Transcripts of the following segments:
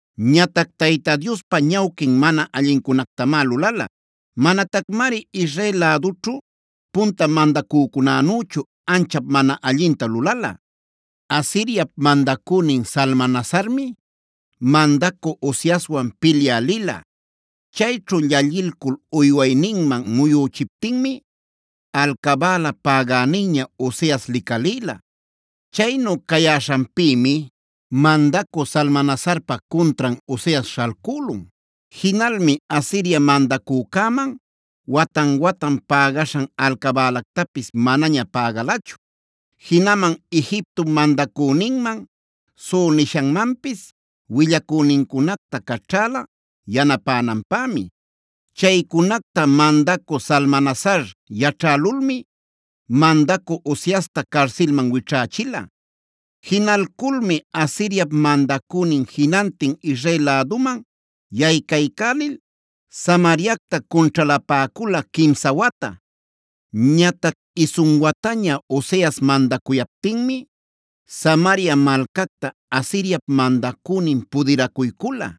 Ñatac Tayta Diospa ñawquin mana allincunactamá lulala. Manatacmari Israel lädućhu punta mandacücunänüchu anchap mana allinta lulala. Asiriap mandacünin Salmanasarmi mandacü Oseaswan pilyä lila. Chayćhu llallilcul uywayninman muyüchiptinmi alcabäla pägäninña Oseas licalïla. Chaynu cayäśhanpïmi mandacü Salmanasarpa cuntran Oseas śhalcülun. Jinalmi Asiria mandacücäman watan-watan pägaśhan alcabälactapis manaña pägalachu. Jinaman Egiptop mandacüninman So nishanmanpis willacünincunacta caćhäla yanapänanpämi. Chaycunacta mandacü Salmanasar yaćhälulmi mandacü Oseasta carsilman wićhächila. Jinalculmi Asiriap mandacünin jinantin Israel läduman yaycaycälil Samariacta cunćhalapäcula quimsa wata. Ñatac isun wataña Oseas mandacuyaptinmi Samaria malcacta Asiriap mandacünin pudiracuycula.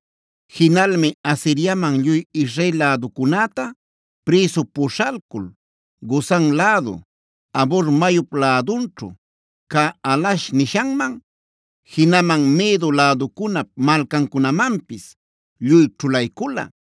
Jinalmi Asiriaman lluy Israel läducunäta prïsu puśhalcul Gozan lädu, Habor mayup lädunćhu cä Halah nishanman, jinaman Medo läducunap malcancunamanpis lluy ćhulaycula,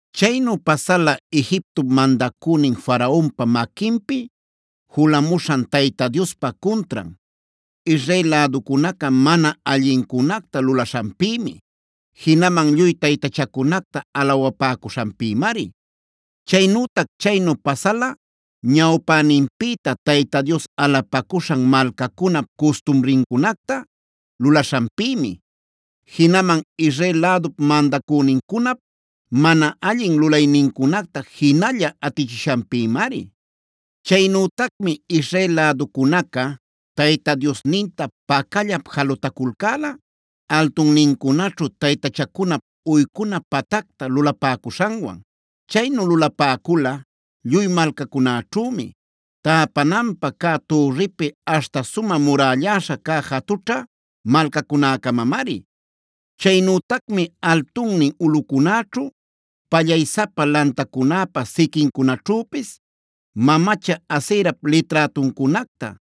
Chaynu pasala Egiptop mandacünin Faraonpa maquinpi julamuśhan Tayta Diospa cuntran, Israel läducunaca mana allincunacta lulaśhanpïmi. Jinaman lluy taytachacunacta alawapäcuśhanpïmari. Chaynütac chaynu pasala ñawpäninpïta Tayta Dios alapacuśhan malcacunap custumrincunacta lulaśhanpïmi, jinaman Israel lädup mandacünincunap mana allin lulaynincunacta jinalla atichishanpïmari. Chaynütacmi Israel läducunaca Tayta Diosninta pacallap jalutaculcäla altunnincunaćhu taytachacunap uycuna patacta lulapäcuśhanwan. Chaynu lulapäcula lluy malcacunäćhümi; täpananpä cä turripi aśhta sumä murällaśha cä jatućha malcacunäcamamari. Chaynütacmi altunnin ulꞌucunäćhu, pallaysapa lantacunäpa siquincunaćhüpis mamacha Aserap liträtuncunacta,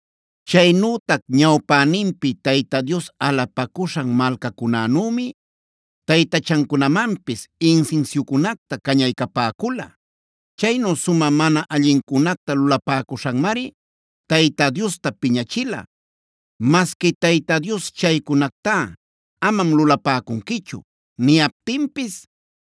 Chaynütac ñawpäninpi Tayta Dios alapacuśhan malcacunänümi taytachancunamanpis insinsiucunacta cañaycapäcula. Chaynu sumä mana allincunacta lulapäcuśhanmari Tayta Diosta piñachila. Masqui Tayta Dios: “Chaycunactá amam lulapäcunquichu” niyaptinpis,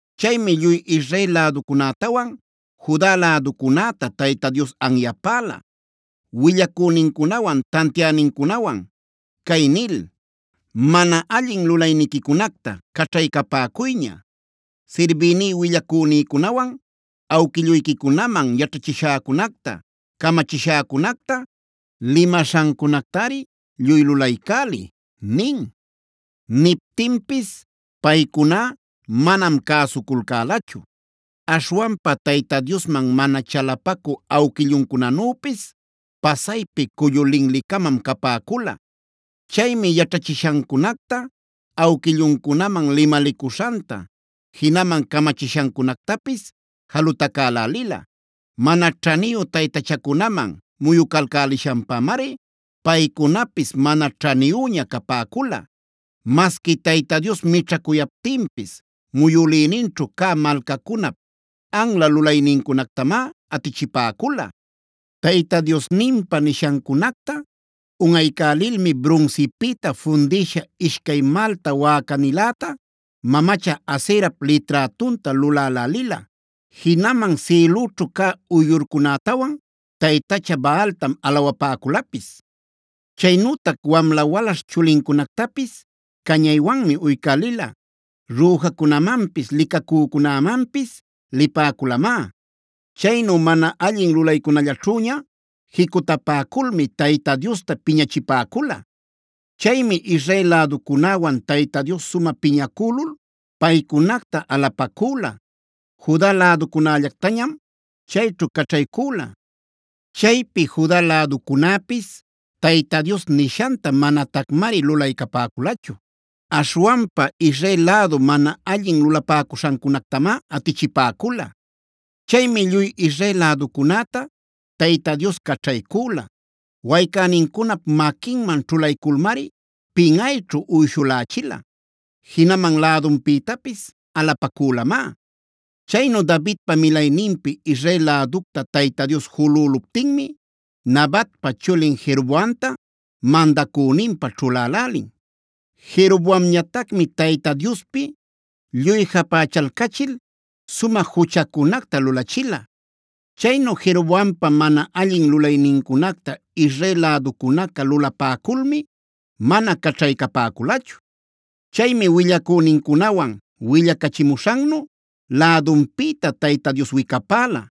Chaymi lluy Israel läducunätawan Juda läducunäta Tayta Dios anyapäla willacünincunawan tantiänincunawan cay nil: “Mana allin lulayniquicunacta caćhaycapäcuyña. Sirbïní willacünïcunawan awquilluyquicunaman yaćhachishäcunacta, camachishäcunacta, limaśhancunactari lluy lulaycäliy” nin. Niptinpis paycuná manam cäsuculcälachu; aśhwanpa Tayta Diosman mana chalapacü awquilluncunanüpis pasaypi cullu linli-camam capäcula. Chaymi yaćhachishancunacta, awquilluncunaman limalicuśhanta, jinaman camachishancunactapis jalutacälälila. Mana ćhaniyu taytachacunaman muyucalcälishanpamari paycunapis mana ćhaniyüña capäcula. Masqui Tayta Dios mićhacuyaptinpis muyülïninćhu cä malcacunap anla lulaynincunactamá atichipäcula. Tayta Diosninpa nishancunacta unꞌaycälilmi brunsipïta fundïsha ishcay malta wäcaniläta, mamacha Aserap liträtunta lulälälila. Jinaman sïlüćhu cä uyllurcunätawan taytacha Baaltam alawapäculapis. Chaynütac wamla-walaśh chulincunactapis cañaywanmi uycälila; rüjacunamanpis licacücunämanpis lipäculamá.d Chaynu mana allin lulaycunallaćhüña jicutapäculmi Tayta Diosta piñachipäcula. Chaymi Israel läducunäwan Tayta Dios sumä piñacülul paycunacta alapacüla. Juda läducunällactañam chayćhu caćhaycüla. Chaypi Juda läducunäpis Tayta Dios nishanta manatacmari lulaycapäculachu. Aśhwanpa Israel lädu mana allin lulapäcuśhancunactamá atichipäcula. Chaymi lluy Israel läducunäta Tayta Dios caćhaycüla. Waycänincunap maquinman ćhulayculmari pinꞌayćhu uyshulächila; jinaman lädunpïtapis alapacülamá. Chaynu Davidpa milayninpi Israel läducta Tayta Dios julüluptinmi, Nabatpa chulin Jeroboamta mandacüninpä ćhulälälin. Jeroboamñatacmi Tayta Diospi lluy japächalcachil, sumä juchacunacta lulachila. Chaynu Jeroboampa mana allin lulaynincunacta Israel läducunaca lulapäculmi, mana caćhaycapäculachu. Chaymi willacünincunawan willacachimuśhannu lädunpïta Tayta Dios wicapäla.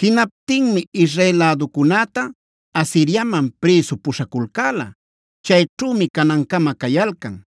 Jinaptinmi Israel läducunäta Asiriaman prïsu puśhaculcäla. Chayćhümi canancama cayalcan.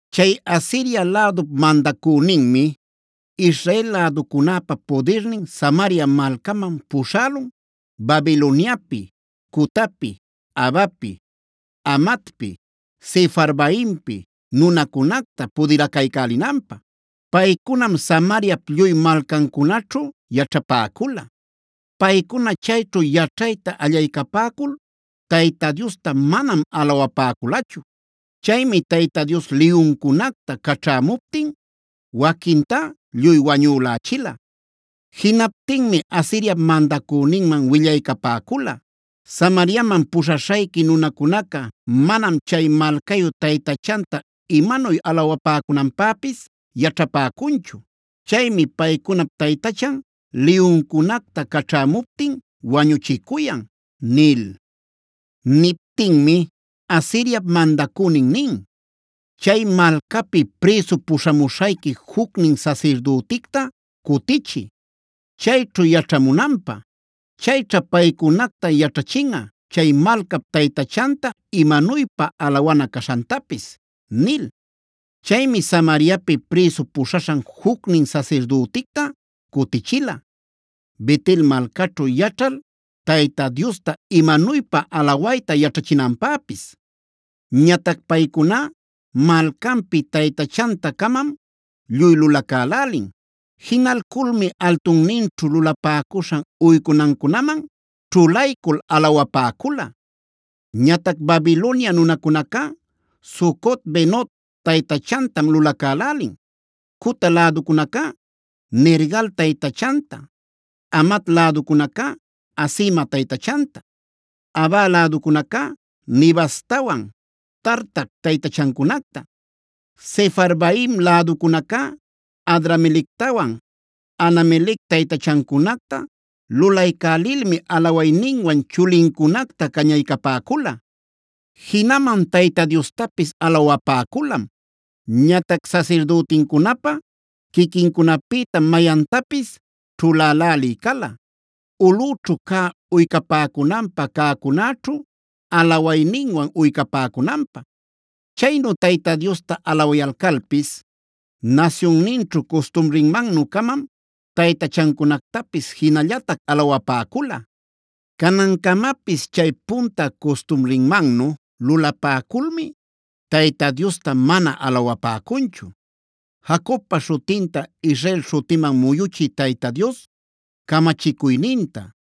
Chay Asiria lädup mandacüninmi Israel läducunäpa pudirnin Samaria malcaman puśhälun Babiloniapi, Cutapi, Avapi, Hamatpi, Sefarvaimpi nunacunacta pudiracaycälinanpä. Paycunam Samariap lluy malcancunaćhu yaćhapäcula. Paycuna chayćhu yaćhayta allaycapäcul, Tayta Diosta manam alawapäculachu. Chaymi Tayta Dios liyuncunacta caćhämuptin waquintá lluy wañülächila. Jinaptinmi Asiriap mandacüninman willaycapäcula: “Samariaman puśhaśhayqui nunacunaca manam chay malcayu taytachanta imanuy alawapäcunanpäpis yaćhapäcunchu. Chaymi paycunap taytachan liyuncunacta caćhämuptin wañuchicuyan” nil. Niptinmi Asiriap mandacünin nin: “Chay malcapi prïsu puśhamuśhayqui jucnin sasirdüticta cutichiy, chayćhu yaćhamunanpä. Chayćha paycunacta yaćhachinꞌa chay malcap taytachanta imanuypa alawana caśhantapis” nil. Chaymi Samariapi prïsu puśhaśhan jucnin sasirdüticta cutichila, Bet-el malcaćhu yaćhal Tayta Diosta imanuypa alawayta yaćhachinanpäpis. Ñatac paycuná malcanpi taytachanta-camam lluy lulacälälin. Jinalculmi altunninćhu lulapäcuśhan uycunancunaman ćhulaycul alawapäcula. Ñatac Babilonia nunacunacá Sucot-benot taytachantam lulacälälin, Cuta läducunacá Nergal taytachanta, Hamat läducunacá Asima taytachanta, Ava läducunacá Nibhaztawan Tartac taytachancunacta, Sefarvaim läducunacá Adramelectawan Anamelec taytachancunacta lulaycälilmi alawayninwan chulincunacta cañaycapäcula. Jinaman Tayta Diostapis alawapäculam. Ñatac sasirdütincunapä quiquincunapïtam mayantapis ćhulälälï cala, ulꞌüćhu cä uycapäcunanpä cäcunäćhu alawayninwan uycapäcunanpä. Chaynu Tayta Diosta alawayalcalpis nasyunninćhu custumrinmannü-camam taytachancunactapis jinallatac alawapäcula. Canancamapis chay punta custumrinmannu lulapäculmi Tayta Diostá mana alawapäcunchu. Jacobpa śhutinta Israel śhutiman muyuchï Tayta Dios camachicuyninta,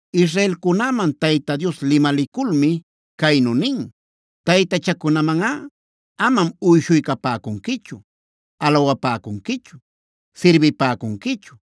Israelcunäman Tayta Dios limaliculmi caynu nin: “Taytachacunamanꞌa amam uyshuycapäcunquichu, alawapäcunquichu, sirbipäcunquichu,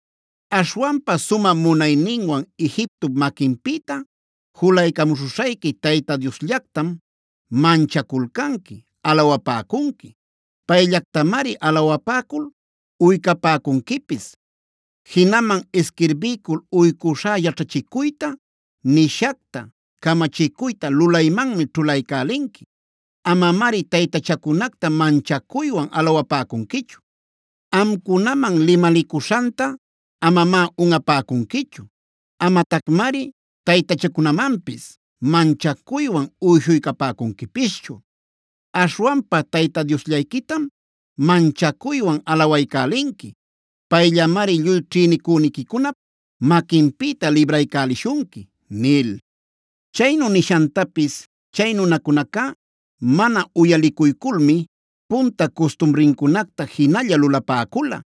Aśhwanpa sumä munayninwan Egiptop maquinpïta julaycamuśhuśhayqui Tayta Diosllactam manchaculcanqui, alawapäcunqui.g Payllactamari alawapäcul uycapäcunquipis. Jinaman isquirbiycul uycuśhá yaćhachicuyta, nishacta, camachicuyta lulaymanmi ćhulaycälinqui. Amamari taytachacunacta manchacuywan alawapäcunquichu. Amcunaman limalicuśhanta amamá unꞌapäcunquichu. Amatacmari taytachacunamanpis manchacuywan uyshuycapäcunquipischu. Aśhwanpa Tayta Diosllayquitam manchacuywan alawaycälinqui. Payllamari lluy ćhïnicüniquicunap maquinpïta libraycälishunqui” nil. Chaynu nishantapis chay nunacunacá mana uyalicuyculmi punta custumrincunacta jinalla lulapäcula.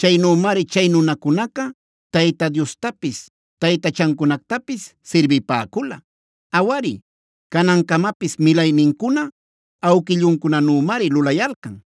Chaynümari chay nunacunaca Tayta Diostapis taytachancunactapis sirbipäcula. Awari, canancamapis milaynincuna awquilluncunanümari lulayalcan.